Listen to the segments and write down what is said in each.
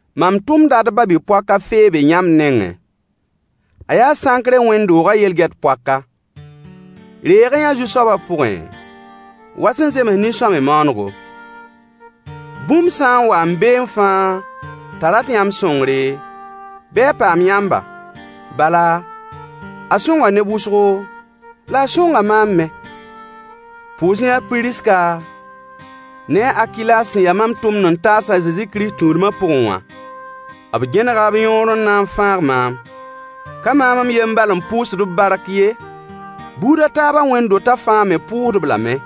Mam tʋmda d ba-bi-poak a Feebe yãmb nengẽ. A yaa Sãnkre wẽnd-doogã yel-gɛt poaka. Reeg-y-yã-a Zu-soaba pʋgẽ, wa sẽn zems nin-sõamy maanego. Bũmb sã n wa n beẽ fãa t'a rat yãmb sõngre, bɩ a paam yãmba, bala, a sõnga neb wʋsgo, la a sõnga maam me. Pʋʋs-y-yã a Piriska ne a Akilas sẽn ya mam tʋmd-n-taas a Zezi Kirist tũudmã pʋgẽ wã. B gẽnega b yõor n na n fãag maam. Ka maam n yen n bal n pʋʋsd-b bark ye, buud a taabã wẽnd-dotã fãa me pʋʋsd-b lame.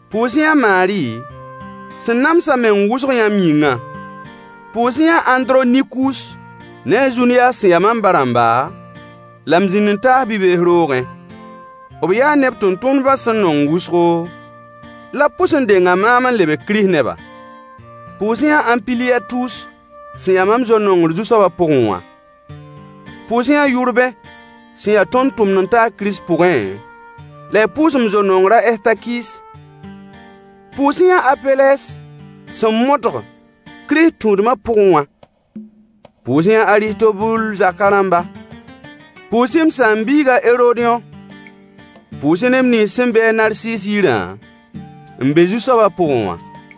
Pʋʋs-y-yã a Maari sẽn nams a meng wʋsg yãmb yĩngã. Pʋʋs-y-yã a Andronikus ne a Zunyas sẽn ya mam ba-rãmba la m zĩnd-n-taas bi-bees roogẽ. B yaa neb tẽn-tʋmdbã sẽn nong wʋsgo, la b pʋs n denga maam n lebg Kirist neba. Pʋʋs-y-yã a Ampiliyatus sẽn ya mam zo-nongr Zu-soabã pʋgẽ wã. Pʋʋs-y-yã a Yʋrbẽ sẽn ya tõnd tʋmd-n-taag Kirist pʋgẽ, la y pʋʋs m zo-nongr a Ɛstakis. Pʋʋs-y-yã a Apelɛs, sẽn modg Kirist tũudmã pʋgẽ wã. Pʋʋs-y-yã a Aristobul zaka rãmba. Pʋʋs-y m saam-biig a Herodyõ. Pʋʋs-y neb nins sẽn be a Narsis yirã n be Zu-soabã pʋgẽ wã.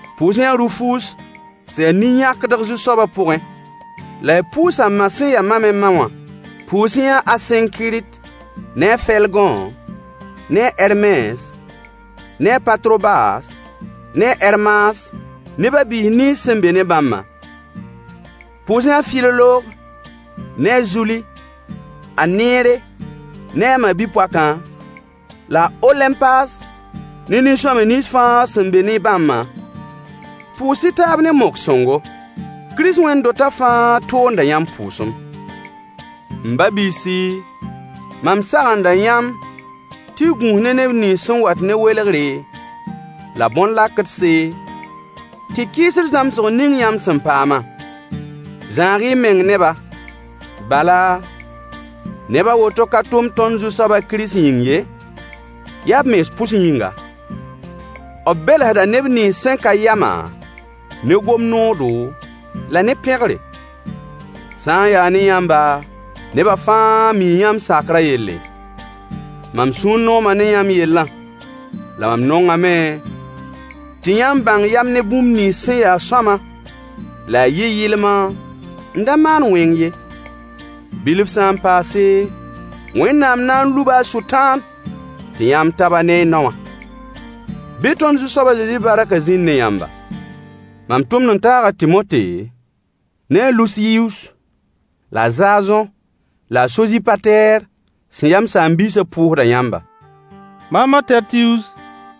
Pʋʋs-y-yã a Rufus sẽn ya nin-yãkdg Zu-soabã pʋgẽ, la y pʋʋs a ma sẽn ya mam me ma wã. Pʋʋs-y-yã a Asẽnkirt, ne a Felgõ, ne a Hɛrmes, ne a Patrobas, ne a Hɛrmas ne ba-biis nins sẽn be ne bãmbã. Pʋʋs-y-yã Filolog ne a Zuli, a Neere ne a ma-bi-poakã, la a Olẽmpas ne nin-sõamy nins fãa sẽn be ne bãmbã. Pʋʋs-y taab ne mok-sõngo. Kirist Wẽnd-dotã fãa toonda yãmb pʋʋsem. M ba-biisi, mam sagenda yãmb tɩ y gũus ne neb nins sẽn wat ne welgre la bõn-lakdse, tɩ kɩɩsd zãmsg ning yãmb sẽn paamã. Zãag-y y meng ne-ba. Bala, neb a woto ka tʋmd tõnd Zu-soabã, Kirist yĩng ye, yaa b mens pʋs yĩnga. B belsda neb nins sẽn ka yamã ne gom noodo la ne pẽgre. Sã n yaa ne yãmba, neba fãa mii yãmb sakrã yelle. Mam sũur nooma ne yãmb yellã, la mam nongame tɩ yãmb bãng yam ne bũmb nins sẽn ya sõama, la y yɩ yɩlma n da maand wẽng ye. Bilf sã n paase, Wẽnnaam na n luba a Sʋtãan tɩ yãmb tab-a ne y nao wã. Bɩ tõnd Zu-soab a Zezi barkã zĩnd ne yãmba. Mam tʋmd-n-taag a Tɩmote ne a Lusiyus la a Zazõ la Sozipatɛɛr sẽn ya m saam-biisã pʋʋsda yãmba. Maam a Tɛrtiyus,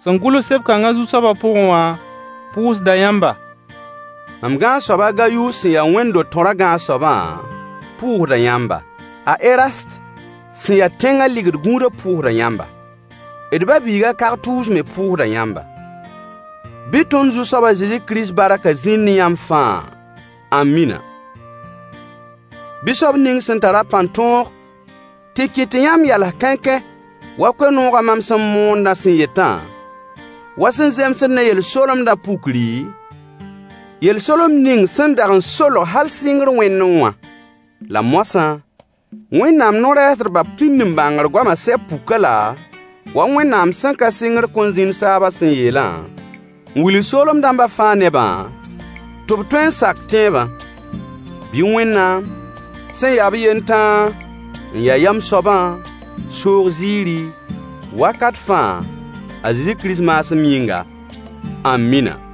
sẽn gʋls seb-kãngã Zu-soaba pʋgẽ wã pʋʋsda yãmba. Mam gãag-soab a Gayus sẽn ya Wẽnd-do-tõrã gãag-soabã pʋʋsda yãmba. A Erast sẽn ya tẽngã ligd gũudã pʋʋsda yãmba. D ba-biig a Kartus me pʋʋsda yãmba. [ Bɩ tõnd Zu-soab a Zezi Kirist barkã zĩnd ne yãmb fãa. Ãmina.] Bɩ soab ning sẽn tar-a pãn-tõog tɩ kɩt tɩ yãmb yals kãenkãe wa koe-noogã mam sẽn moondã sẽn yetã, wa sẽn zemsd ne yel-solemdã pukri, yel-solemd ning sẽn dag n solg hal sɩngr wẽndẽ wã. La moasã, Wẽnnaam no-rɛɛsdbã pĩnd-n-bãngr goamã sɛb puk-a-la wa Wẽnnaam sẽn ka sɩngr kõn zĩnd saabã sẽn yeelã, n wilg soolem dãmba fãa nebã, tɩ b tõe n sak tẽebã. Bɩ Wẽnnaam, sẽn ya b yen tãa n ya yam soabã soog ziiri, wakat fãa, a Zezi Kirist maasem yĩnga. Ãmina!